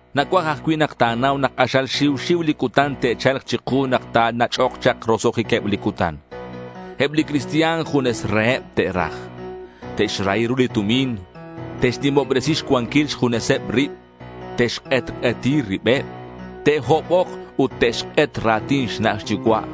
Nacuaj ajcui' nak ta̱nau nak k'axal xiu xiu li cutan te'cha̱lk chiku nak ta̱nach'ok chak roso'jiqueb li cutan. Eb li cristian junes reheb te'raj. Te'xrahi ru li tumin. Te'xnimobresi xcuanquil xjuneseb rib. Te'xk'etk'eti ribeb. Te'hobok ut te'xk'et ra̱tin xna' xyucua'.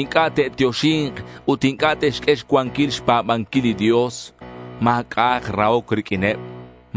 Inc'a' te'tioxi̱nk ut inc'a' te'xq'ue xcuanquil xpa̱banquil li Dios. Ma̱c'a'ak rahoc riq'uineb.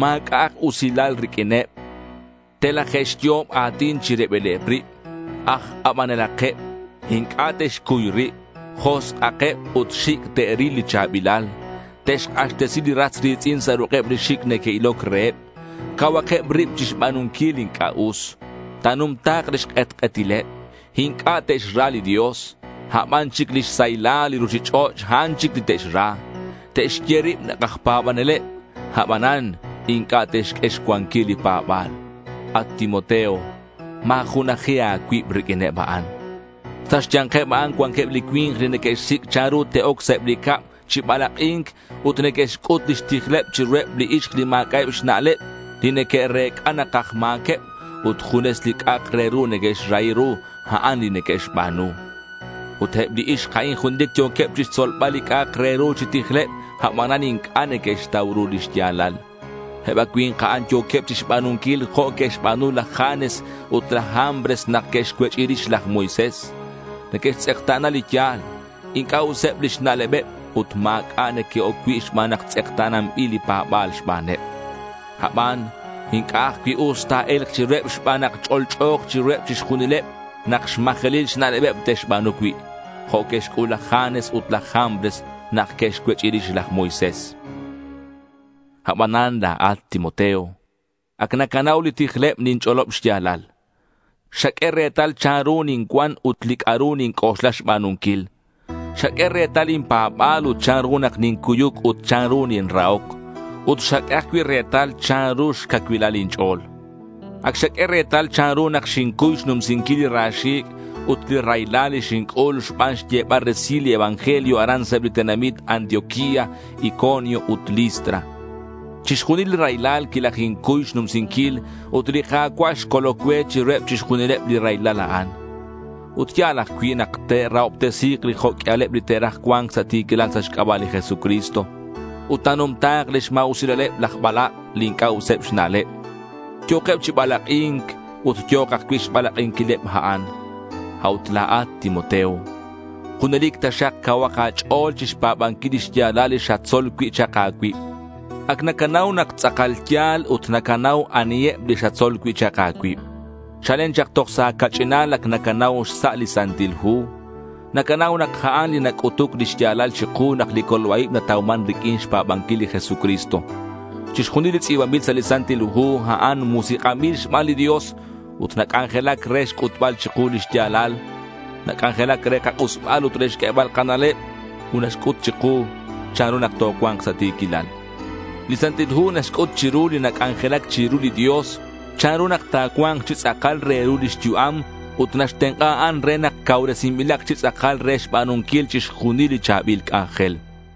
Ma̱c'a'ak usilal riq'uineb. Telaje'xyo'ob a̱tin chi ribileb rib. Aj k'abanelakeb. Inc'a' te'xcuy rib. Josk'akeb ut xic' te'ril li cha̱bilal. Te'xk'axtesi li ras ri̱tz'in sa' ruk'eb li xic' neque'iloc reheb. Cauhakeb rib chixba̱nunquil li inc'a' us. Ta̱numta̱k lix k'etk'etileb. Inc'a' te'xra li Dios. A' ban chic lix saylal li ruchich'och', a'an chic li te'xra. Te'xye rib nak aj pa̱baneleb, abanan inc'a' te'xq'ue xcuanquil li pa̱ba̱l. At Timoteo, ma̱junaji a̱cuib riq'uineb a'an. Sa' xya̱nkeb a'an cuanqueb li cui̱nk li neque'xsic' chanru te'oc sa' eb li cab chi balak'i̱nc ut neque'xc'ut lix tijleb chiruheb li ixk li ma̱c'a'eb xna'leb, li neque'rec'a nak aj ma̱queb, ut junes li c'a'ak re ru neque'xrahi ru, a'an li neque'xba̱nu. Ut eb li ixk a'in junelic yo̱queb chixtzolbal li c'a'ak re ru chi tijleb, abanan inc'a' neque'xtau ru li xya̱lal. Eb a cui̱nk a'an yo̱queb chixba̱nunquil jo' que'xba̱nu laj Janes ut laj Jambres nak que'xcuech'i rix laj Moisés. Neque'xtz'ekta̱na li ya̱l. Inc'a' useb lix na'lebeb ut ma̱c'a' neque'oc cui' xban nak tz'ekta̱nanbil li pa̱ba̱l xbaneb. Aban inc'a' ajcui' us ta̱e̱lk chiruheb xban nak ch'olch'o̱k chiruheb chixjunileb nak xmajelil xna'lebeb te'xba̱nu cui', jo' que'xc'ul laj Janes ut laj Jambres nak que'xcuech'i rix laj Moisés. Abanan la̱at, Timoteo, ac nacanau li tijleb ninch'olob xya̱lal. Xaq'ue retal chanru nincuan ut li c'a'ru ninc'oxla xba̱nunquil. Xaq'ue retal lin pa̱ba̱l ut chanru nak nincuyuc ut chanru ninrahoc. Ut xaq'ue ajcui' retal chanru xcacuilal lin ch'o̱l. Ac xaq'ue retal chanru nak xincuy xnumsinquil li ra xi̱c' ut li raylal li xinc'ul xban xyebal resil li evangelio aran sa' eb li tenamit Antioquía, Iconio ut Listra. Chixjunil li raylal quilajincuy xnumsinquil ut li Ka̱cua' xcoloc cue chiruheb chixjunil li raylal a'an. Ut ya̱l ajcui' nak te'rahobtesi̱k li jo' q'uialeb li te'raj cua̱nc sa' ti̱quilal sa' xc'aba' li Jesucristo. Ut ta̱numta̱k lix ma̱usilaleb laj balak' li inc'a' useb xna'leb. Yo̱keb chi balak'i̱nc ut yo̱k ajcui' xbalak'inquileb a'an. A'ut la̱at, Timoteo, junelic taxak cauhak a̱ch'o̱l chixpa̱banquil li xya̱lal li xatzol cui' chak a̱cuib. Ac nacanau nak tz'akal ya̱l ut nacanau aniheb li xatzol cui' chak a̱cuib. Chalen chak toj sa' a̱ca'ch'inal ac nacanau xsa' li Santil Hu. Nacanau nak a'an li nac'utuc li xya̱lal chiku nak li colba-ib natauman riq'uin xpa̱banquil li Jesucristo. Chixjunil li tz'i̱banbil sa' li Santil Hu, a'an musik'anbil xban li Dios ut nac'anjelac re xc'utbal chiku li xya̱lal. Nac'anjelac re kak'usbal ut re xq'uebal kana'leb ut naxc'ut chiku chanru nak tocua̱nk sa' ti̱quilal. Li Santil Hu naxc'ut chiru li nac'anjelac chiru li Dios chanru nak ta̱cua̱nk chi tz'akal re ru lix yu'am ut naxtenk'a a'an re nak cauresinbilak chi tz'akal re xba̱nunquil chixjunil li cha̱bil c'anjel.